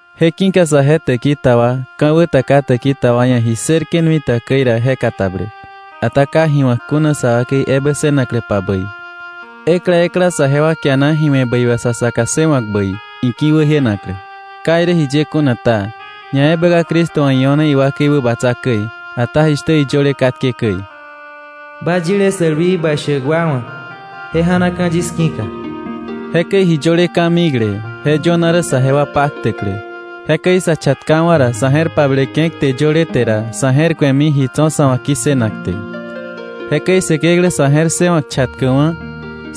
Je ki̱ka saje täki ta wa ka̱wä ta ka täki ta wa ia̱ ji ssërke̱ nui ta käi ra je katabläk, ata ka ji wa̱k kuna sa wakei ebä ssënakläpa bäi. Ekla ekla saje wa kiana ji we̱ bäi wà sa saka ssëwa̱k bäi iki̱wäjienaklä. Ka irä jiye kuna ta, ñaebä ka Cristo wa̱ io̱ne iwakei wäbatsa käi. Ata jishtä iyöle katke käi: “Ba yile sälwii ba shäk wa wa̱ je ja̱naka̱ yis ki̱ka.” Jekäi ji yöle ka̱mikle, je yöna rä saje wa paktäklä. Jekäi sa chatkawa̱ ra, sa̱ je̱r pableke̱ kte yöle te ra, sa̱ je̱r ku̱emi ji tso̱ sa̱ wa̱ ki̱ssënak te. Jekäi Säkeklä sa̱ je̱r ssëwa̱k chatkäkwa̱,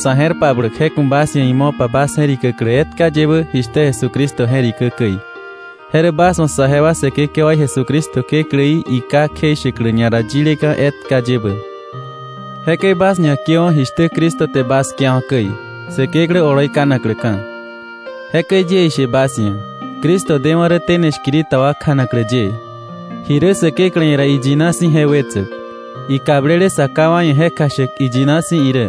sa̱ je̱r pabläk je ku̱ bas ia̱ imo̱pa bas je̱rikäklä etka yebä jishtä Jesucristo je̱rikä käi. Je rä bas wa̱ saje wa Säkekewaí Jesucristo Kekläí iKá kjeishäklä ñara yileka̱ etka yebä. Jekäi bas ñakiöwa̱ jishtä Cristo te bas kiawa̱ käi, Säkeklä oloi kanakläka̱. Jekäi yie ishe bas ia̱, Cristo dewa̱ rä tene shkiri ta wa kjanaklä ye, ji rä Säkeklä ia̱ ra iyina si̱ je wetsäk, ikablele sa ká wa ia̱ je kjashäk iyina si̱ irä,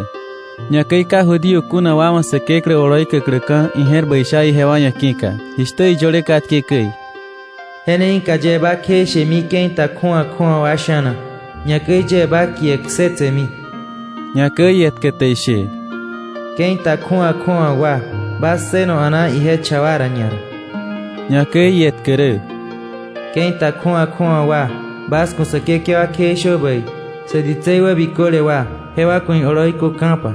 ñakäi ka Judío kuna wa wa̱ Säkeklä oloi käkläka̱ ije̱r bäi sha ijewa ia̱ ki̱ka, jishtä iyöle katke käi: “Je ne ki̱ka yie bä kjeishemi ke̱i ta kju̱awa kju̱awa wa sha̱na, ñakäi yie ba kie ksetsemi.” Ñakäi ietkä te ishe: “Ke̱i ta kju̱awa kju̱awa wa, bas ssëno a̱naa ije cha wa ra ñara.” Ñakäi ietkä rä: “Ke̱i ta kju̱awa kju̱awa wa, bas ku̱ Säkekewa kjeishö bäi, sä ditsei wä biköle wa, jewa ku̱ ioloi köka̱pa.”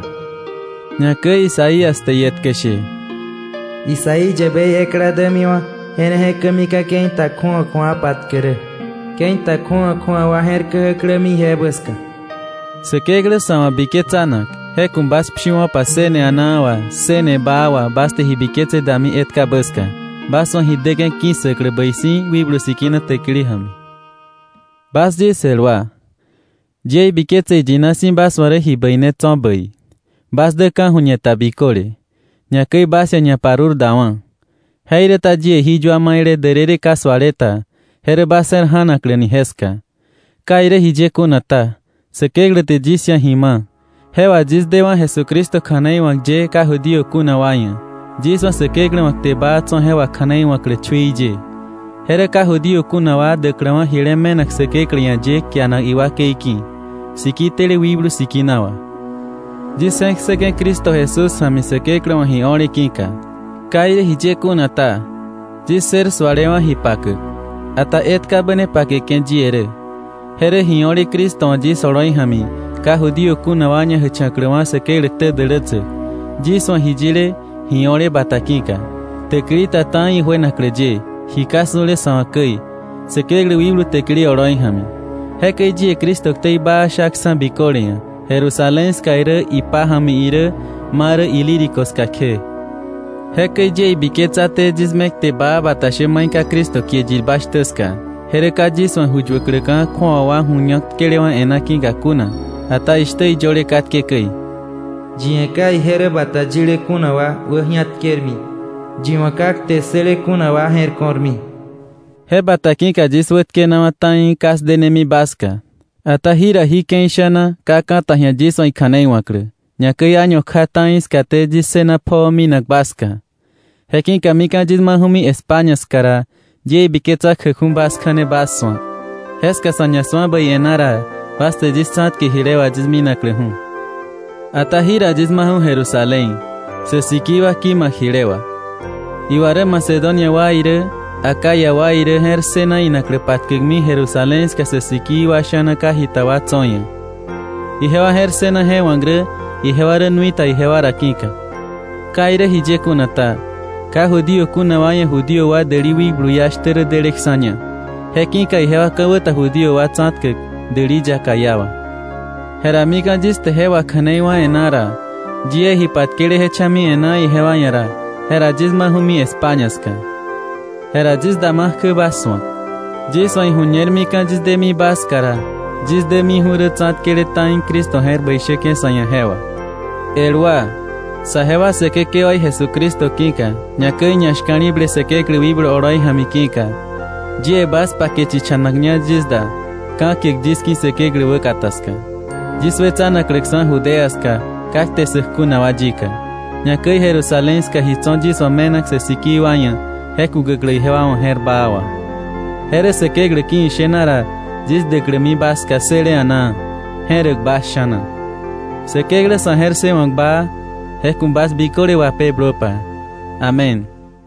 Ñakäi Isaías te ietkä she: “Isaí yäbei ekla dämiwa̱, je ne je̱kämika̱ ke̱i ta kju̱awa kju̱awa wa patkäk rä. Ke̱i ta kju̱awa kju̱awa wa je̱r blämi ije ja̱mi.” Säkeklä sa̱ wa̱ biketsanak, je ku̱ bas pshiwo̱pa ssëne a̱naa wà, ssëne baa wà bas te ji biketse dami etkabä ska, bas wa̱ ji däke̱ ki̱ssäklä bäi si̱ Wikblu Sikina täkili ja̱mi. Bas yis el wa, yie ibiketse iyina si̱ bas wa̱ rä ji bäi ne tso̱ bäi, bas dä ka̱ju̱ñe ta biköle, ñakäi bas ia̱ ñaparurdawa̱. Jeiräta yie ji yua maile därërë ka suale ta je rä bas je̱r ja̱nakläni jeska. Ka irä jiye kuna ta, Säkeklä te yis ia̱ ji ma̱, je wà yis dewa̱ Jesucristo kja̱nei wa̱k ye ka Judío kuna wa ia̱, yis wa̱ Säkeklä wa̱ kte baa tso̱ je wakja̱nei wa̱klä chui ye. Je rä ka Judío kuna wa däkläwa̱ jile me̱nak Säkeklä ia̱ ye kianak iwakei ki̱, siki tele Wikblu Sikina wà. Yis je̱k ssäke̱ Cristo Jesús ja̱mi Säkeklä wa̱ ji o̱le ki̱ka. Ka irä jiye kuna ta, yis ssër sualewa̱ ji pakäk, ata etkabä ne pakeke̱ yie rä, je rä ji o̱le Cristo wa̱ yis oloi ja̱mi ka Judío kuna wa ñajächa̱kläwa̱ Säkeklä ktä dälätsäk, yis wa̱ ji yile ji o̱le bata ki̱ka, täkili ta ta̱i ijuenaklä ye, ji ka su̱le sa̱ wa̱ käi, Säkeklä wikblu täkili oloi ja̱mi. Jekäi yie Cristo ktei baa shaksa̱ biköle ia̱ Jerusalén ska irä ipája̱mi irä ma rä Ilírico ska kje. Jekäi yie ibiketsaté yis me kte baa bata shä mai ka Cristo kie yirba shtä ska, je rä ka yis wa̱ ju yuäkläka̱ kju̱awa wa̱ ju ñak tkelewa̱ e̱ná ki̱ka kuna, ata jishtä iyöle katke käi: “Yi ia̱ ka ije rä bata yile kuna wa wäji̱atkermi; Yi wa̱ ka kte ssële kuna wa je̱r ko̱rmi.” Je bata ki̱ka yis wätkenawa̱ ta̱i ka 'sdenemi bas ska. Ata jira jí ke̱i sha̱na ka ka̱ ta ji̱a yis wa̱ ikja̱nei wa̱klä, ñakäi año kja ta̱i skaté yis ssëna pjoo minak bas ska, je ki̱ka mika̱ yis maju̱mi España ska ra, yie ibiketsa kjäkju̱ bas kja̱ne bas su̱ak. Jeska sa̱ ñasu̱a bäi e̱ná ra, bas te yis tsa̱tke jile wà yis minakläju̱. Ata jira yis maju̱ Jerusalén, sä sikii wa ki̱ma̱k jile wà. Iwa rä Macedonia wa irä Acaya wa irä je̱r ssëna inaklä patkäkmi Jerusalén ska sä sikii wa sha̱na ka jita wa tso̱ ia̱. Ijewa je̱r ssëna je wa̱k rä ijewa rä nui ta ijewa ra ki̱ka. Ka irä jiye kuna ta, ka Judío kuna wa ia̱ Judío wa däli wikblu iá shtä rä deleksa̱ña. Je ki̱ka ijewa ka̱wä ta Judío wa tsa̱tkäk däli yaka iá wà. Jera mika̱ yis te je wakja̱nei wá̱ e̱ná ra, yie ji patkele je cha̱mi e̱ná ijewa ia̱ ra, jera yis maju̱mi España ska. Jera yis dama kjä bas su̱ak. Yis wa̱ iju̱ñer mika̱ yis demi ba ska ra, yis dämiju̱ rä tsa̱tkele ta̱i Cristo je̱r bäi shäke̱ sa̱ ia̱ je wà. El wa, saje wa Säkekewaí Jesucristo ki̱ka, ñakäi ñashka̱li̱ble Säkeklä wikblu oloi ja̱mi ki̱ka, yie bas pake chichanakña yis da, ka̱kiäk yis ki̱ Säkeklä wäkata ska, yis wetsanakläksa̱ Judea ska ka kte ssäk kuna wa yika, ñakäi Jerusalén ska ji tso̱ yis wa̱ me̱nak sä sikii wa ia̱ je kukäklä ijewa wa̱ je̱r baa wà, je rä Säkeklä ki̱ ishena ra yis däklämi bas ska ssële a̱naa, je̱räk bas sha̱na. Säkeklä sa̱ je̱r ssëwa̱k baa, je ku̱ bas biköle wapeblöpa. Amén.